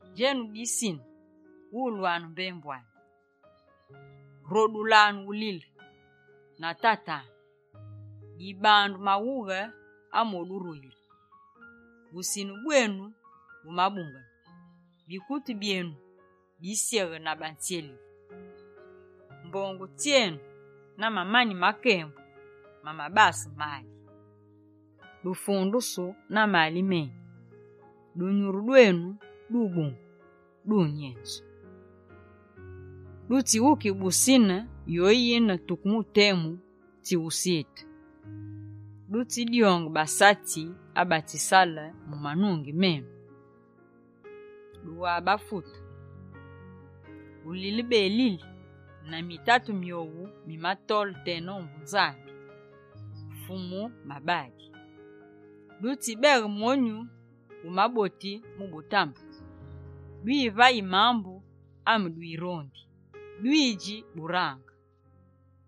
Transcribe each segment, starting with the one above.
Djenu bisine, wulwanu mbembu ami. Rodulanu ulile na tatanu! Dibandu maghughe amoduruyile. Busine bwenu bumabungene. Bikutu byenu bisyeghe na batsyelili. Mbongu tsyenu na mamani menu ma kembu bimabase maali. Dufundusu na maali meni. Dunyuru dwenu dubungu, dunyenzu. Dutsiwukighe busine yoyine tuke mu temu tsyusite. Dutsidyonge basatsi abatsisale mu manungi menu, dughabafute. Ulilebelili na mitatu myowu mimatole tena ombu Nzambi, Fumu mabadi. Dutsibeghe monyu wu maboti mu butambe, dwivayi mambu ame dwirondi, dwidji burange,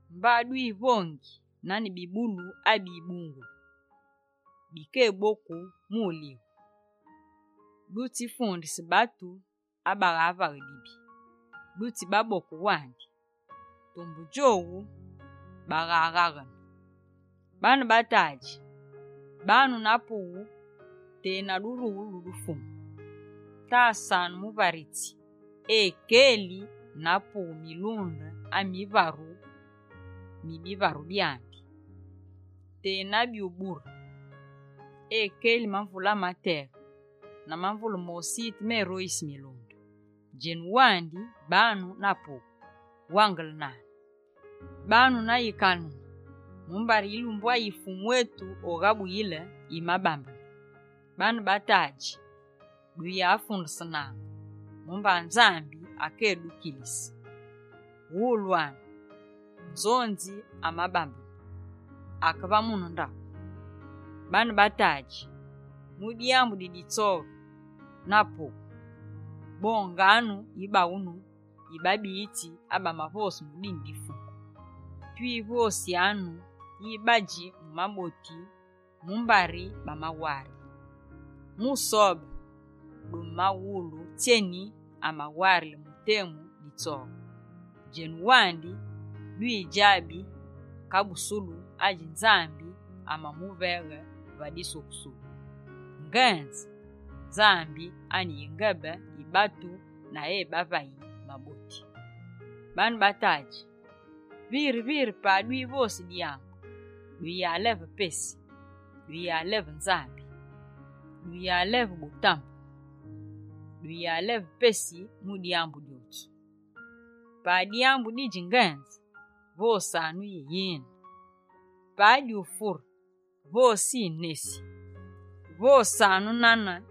mba dwivongi nane bibulu abibungulu, bikeboku mu ulighu. Dutsifundise batu abaghavaghe dibi, dutsibaboke wandi. Tumbe djowu baghaghaghene. Baane ba tadji, banu na pughu tena durughulu du Fumu. Tasanu muvaritsi ekeli na pughu milunde ami fwaru mi bivaru byandi, tena byubure. Ekeli mamvule amateghe na mamvule ma usite ameroyisi milunde. Djenu wandi banu na pughu, wangelenanu. Banu na yikanene mumbari yilumbu ayi Fumu etu oghabuyile yimabambene. Baane ba tadji, duyafundesenaange mumba Nzambi akédukilise. Wulwanu, nzonzi amabambene, ake va mune ndaghu. Baane ba tadji, mu dyambu di ditsoghe na pughu, bonganu yibaghunu yi babiyitsi abamavose mu dine di Fumu. Twivosyanu yi badji mu maboti, mumbari bamawarile. Mu Sobe, dumaghulu tsyeni amawarile mu temu ditsoghe. Djenu wandi, dwidjabi kabusulu adji Fumu Nzambi amamuveghe va disukusulu. Ngenze, Fumu Nzambi ane yingebe yi batu na ebavayi maboti. Baane ba tadji, viri-viri pa dwivosi dyambu, duyaleve pesi. Duyaleva Nzambi, duyaleva butambe, duyaleva pesi mu dyambu dyotsu. Pa dyambu didji ngenze, vosanu: «yine». Pa dyufure, vose yi «nesi». Vosanu nane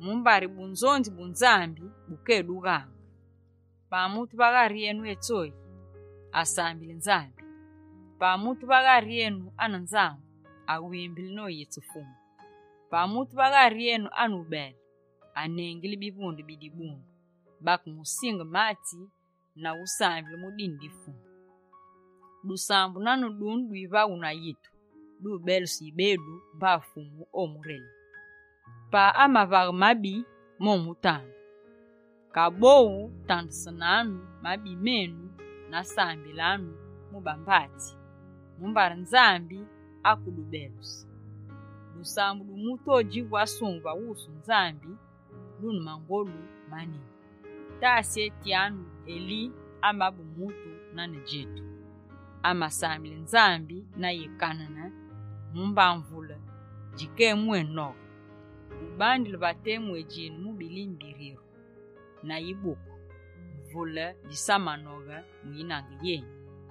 mumbari bunzonzi bu Nzambi bukédughaange. Pa mutu va ghari enu etsoyi, asambili Nzambi. Pa mutu va ghari enu ane nzangu, awimbili noyitsi Fumu. Pa mutu va ghari enu ane ubele, anengili bivunde bi dibundu, bakemusinge matsi na usambile mu dine di Fumu. Dusambu nane dune dwivaghu na yitu, dubeluse yibedu mba Fumu omurelighe. Pa amavaghe mabi momutandu. Kaboghu tandesenanu mabi menu na sambilanu mu bambatsi, mumbari Nzambi akedubeluse. Dusambu du mutu odjivu asungeme va wusu Nzambi dune mangolu maneni. Tasetyanu Eli amabe mutu nane djetu. Amasambile Nzambi na yikanene mumba mvule djikémwénoghe. Ubandile va temu adjine mu bilime biryeru na yibuku, mvule djisamanoghe mu yinange yeni.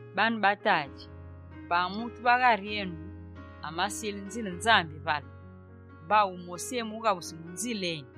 Baane ba tadji, pa mutu va ghari enu amasile nzile Nzambi vale, mba wumosi emughabusi mu nzile eni,